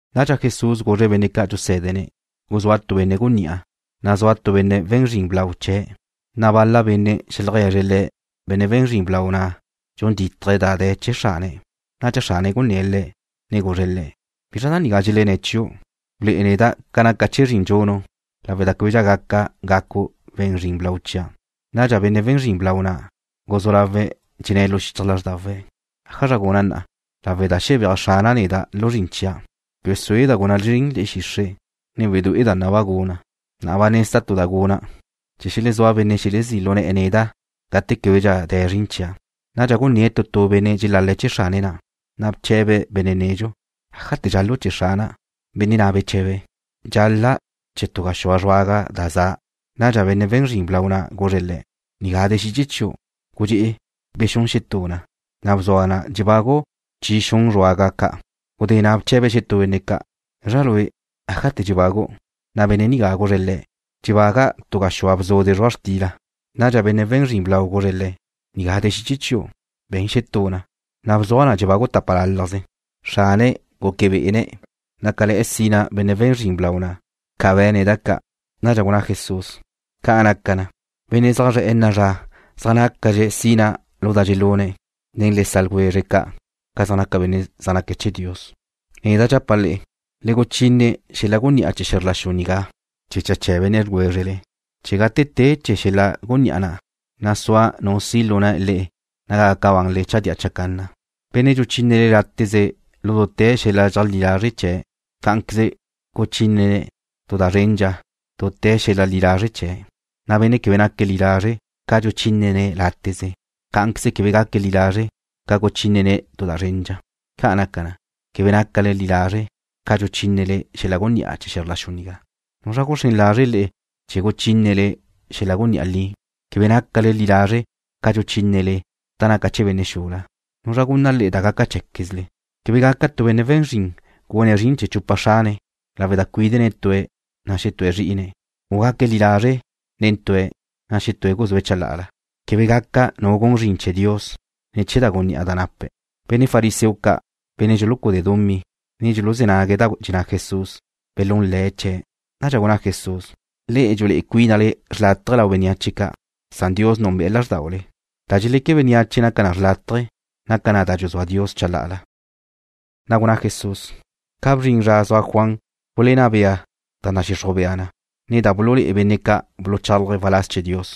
Nadxa Jesús guzre̱' benne' ca' dxusé̱dene̱': ―Guzúa tu benne' gunní'a, na' zua tu benne' we̱n zrin blau chee̱'. Na' bal-la benne' xeajlegue̱zre̱' le̱' benne' we̱n zrin blau na' dxun dítaje̱' da de̱ chee̱ xrane̱'. Nadxa xrane̱' gunné̱' le̱', ne guzre̱' le̱': “¿Bizra da nigá dxelenné̱' chiu'? Blué'e neda' ca naca chee̱ zrin dxunu', lawe' da québedxa gaca gacu' we̱n zrin blau chia'.” Nadxa benne' we̱n zrin blau na' guzú lawe̱' dxenné̱' lu xichaj lázrdawe̱': ¿ájazra guna' na'a, lawe' da xebéaj xrana' neda' lu zrin chia'? Quebe sueda' guna' zrin le̱'e̱ xixre', ne wedué'eda' naba' guna'. Na'a ba nezda' tu da guna' chee̱ xelezúa benne' xelezí' lu ne̱'e̱ neda' gate québedxa de̱ zrin chia'. Nadxa gunné̱' tu tu benne' dxelal-le̱' chee̱ xrane̱' na'. Na' bche̱be̱' benne' nedxu: “¿ájate̱ dxal-lu' chee̱ xrana'?” Benne' na' beche̱be̱': “Dxal-la' chee̱' tu gaxúa zruaga da za.” Nadxa benne' we̱n zrin blau na' guzre̱' le̱': “Nigá de̱ xiche chiu'. Gudxé'e bexún xetú na, na' bzuaj na dxebagu' chi xun zruaga ca'.” Gudé na' bche̱be̱' xetú benne' ca': “¿Gazra lue', ájate̱ dxebagu'?” Na' benne' nigá guzre̱' le̱': “Dxebaga' tu gaxúa bzude' zrua' xtila.” Nadxa benne' we̱n zrin blau guzre̱' le̱': “Nigá de̱ xiche chiu'. Be̱n xetú na, na' bzuaj na dxebagu' tápalalajze.” Xrane̱' gúquebe'ene̱' nácale̱'e̱ sina benne' we̱n zrin blau na' ca be̱ne̱' da ca'. Nadxa gunná Jesús: ―Ca' naca na, benne' zaj zre̱'e̱ na'a zra zaj nácadxe̱' sina lu da dxelune̱' nen le sa' ljwezre̱' ca', ca zaj naca benne' zaj naque̱' chee̱ Dios. ’Neda' dxapa' le'e, le guchine xel-la gunní'a chee̱ xe̱zr la xu nigá chee̱ cha benne' ljwézrele, chee̱ gate te chee̱ xel-la gunní'a na', na' sua nu si' lu na' le'e naga gaca banle chadía chacanna. ’Benne' dxuchínene̱' láteze lu dute̱ xel-la li lazre' chee̱', cá'anqueze guchínene̱' tu da zrendxa dute̱ xel-la li lazre' chee̱', na' benne' quebe naque̱' li lazre' ca dxuchínene̱' láteze, cá'anqueze quebe gaque̱' li lazre' ca guchínene̱' tu da zrendxa. Ca' naca na, che quebe nácale li lazre' ca dxuchínele xel-la gunní'a chee̱ xe̱zr la xu nigá, ¿nuzra guxrén lazre̱' le'e chee̱ guchínele xel-la gunní'a li? Che quebe nácale li lazre' ca dxuchínele da naca chee̱ benne' xula, ¿nuzra gunna le'e da gaca cheé̱quezle? ’Quebe gaca tu benne' we̱n zrin gune̱' zrin chee̱ chupa xrane̱', lawe' da cuídene̱' tue̱', na' xetúe̱' zrí'ine̱', u gaque̱' li lazre' nen tue̱', na' xetúe̱' guzúe̱' chalá'ala. Quebe gaca nu gun zrin chee̱ Dios, ne chee̱ da gunní'a da nape̱'. Benne' fariseo ca', benne' dxulucúdee̱' dumí, ne dxuluzé̱ nague̱' da dxenná Jesús, belún le̱' chee̱'. Nadxa gunná Jesús: ―Le'e dxulé'e cuínale xrlátaje lau bénneache ca', san Dios núnbe'e̱ lázrdaule. Da dxeleque bénneache naca na xrlátaje, naca na da dxuzúa Dios chalá'ala. Na' gunná Jesús: ―Ca bzrin zra zua Juan gulenná bea da nadxixruj bea na, ne da bululé'e benne' ca' buluchálaje̱' waláz chee̱ Dios.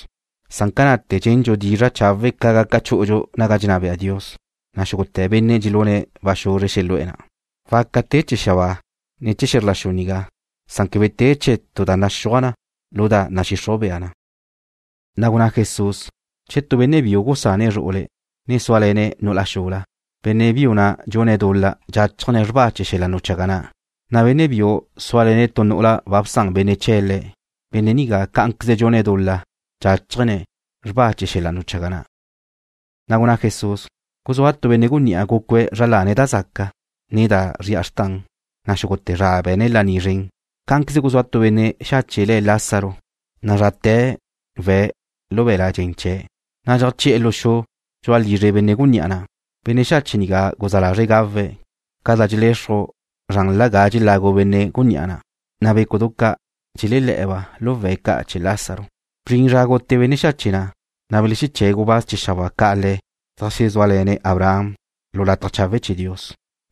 Na'a, ca na'te̱ dxendxu dizra' chawe' ca gaca chú'udxu naga dxenná bea Dios, na' xúgute̱ benne' dxelune̱' ba xuzre xelu'e̱ na'. ’Waca te chee̱ xabáa, ne chee̱ xe̱zr la xu nigá, san quebe te chee̱ tu da naxúaj na lu da nadxixruj bea na. Na' gunná Jesús: ―Che tu benne' biu gusane̱' zru'ule̱', ne súale̱ne̱' nu'ula xula, benne' biu nigá dxune̱' dul-la dxáchajne̱' xrba chee̱ xel-la wechaga na', na' benne' biu zúale̱ne̱' tu nu'ula ba bsan benne' chee̱' le̱', benne' nigá cá'anqueze dxune̱' dul-la dxáchajne̱' xrba chee̱ xel-la wechaga na'. Na' gunná Jesús: ―Guzúa tu benne' gunní'a, gúcue̱' zra lane̱' da zaca, ne da zri'a xrtan, na' xúgute̱ zra be̱ne̱' laní zren. Cá'anqueze guzúa tu benne' xache' le̱' Lázaro, nazrate̱ we̱' lu be̱l-la' dxen chee̱', na' dxeajché'e̱ lu xu dxu'a lizre benne' gunní'a na'. Benne' xache' nigá guzá lazre̱' gawe̱' ca da dxelexruj zranla ga dxelagu benne' gunní'a na', na' bécudu ca' dxelelé̱'e̱ba' lu we̱' ca' chee̱ Lázaro. Bzrin zra gute benne' xache' na', na' belexeché̱' gubáz chee̱ xabáa ca' le̱' zeajxezúale̱ne̱' Abraham lu lataj chawe' chee̱ Dios.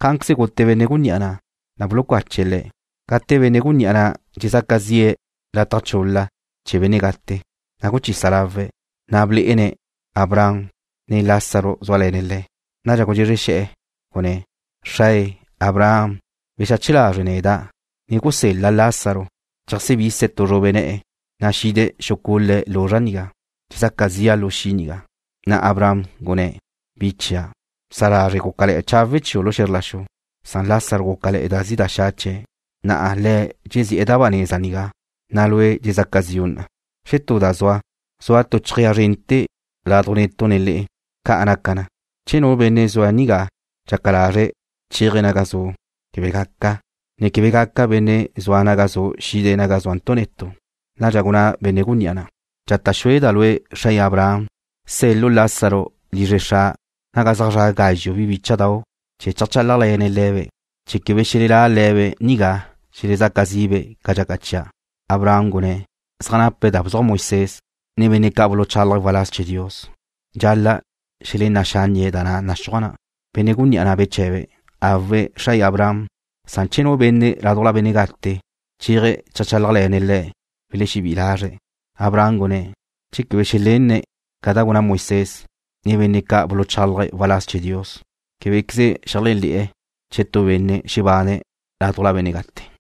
Cá'anqueze gute benne' gunní'a na', na' bulucache̱' le̱'. Gate benne' gunní'a na' dxezaca zi'e̱ lataj chul-la chee̱ benne' gate, na' guchisa lawe̱', na' blé'ene̱' Abraham zue̱' zitu', ne Lázaro zúale̱ne̱' le̱'. Nadxa gudxezre xe̱'e̱, gunné̱': “¡Xrae, Abraham, bexache lazre' neda', ne gusel-la Lázaro, cheajsebise̱' tu zrube ne̱'e̱, na' xide̱' xucule̱' luzra' nigá! Dxezaca zi'a lu xi' nigá.” Na' Abraham gunné̱': “Bi chia', bsa lazre' gúcale̱'e̱ chawe' chiu' lu xe̱zr la xu, san Lázaro gúcale̱'e̱ da zi' da xa' chee̱'. Na'a le̱' dxezi'e̱ da ba neza nigá, na' lue' dxezaca zi'u na'. Xetú da zua, zua tu chejéa zrente̱ laduj netu' ne le'e. Ca' naca na, che nu benne' zua nigá dxaca lazre̱' chéaje̱' naga zu', quebe gaca, ne quebe gaca benne' zua naga zu' xide̱' naga zúantu' netu'.” Nadxa gunná benne' gunní'a na': “Dxata' xueda' lue', xrae Abraham, sel-lu' Lázaro lizre xra', naga zaj zra' gazxu' bi bícha'dau', chee̱ cheajchálajle̱ne̱'-be', chee̱ quebe xelelá' le̱be' nigá xelezaca zi'be' ca dxaca chia'.” Abraham gunné̱': “Zaj nape̱' da buluzúaj Moisés, ne benne' ca' buluchálaje̱' waláz chee̱ Dios. Dxal-la' xelená' xánnie̱' da na' naxúaj na.” Benne' gunní'a na' beche̱be̱': “Awe', xrae Abraham, san che nu benne' ládujla benne' gate chéaje̱' cheajchálajle̱ne̱' le̱', welexebí'i lazre̱'.” Abraham gunné̱': “Che quebe xelenne̱' ca da gulenná Moisés, ne benne' ca' buluchálaje̱' waláz chee̱ Dios, québequeze xeléajle̱'e̱ che tu benne' xebane̱' ládujla benne' gate.”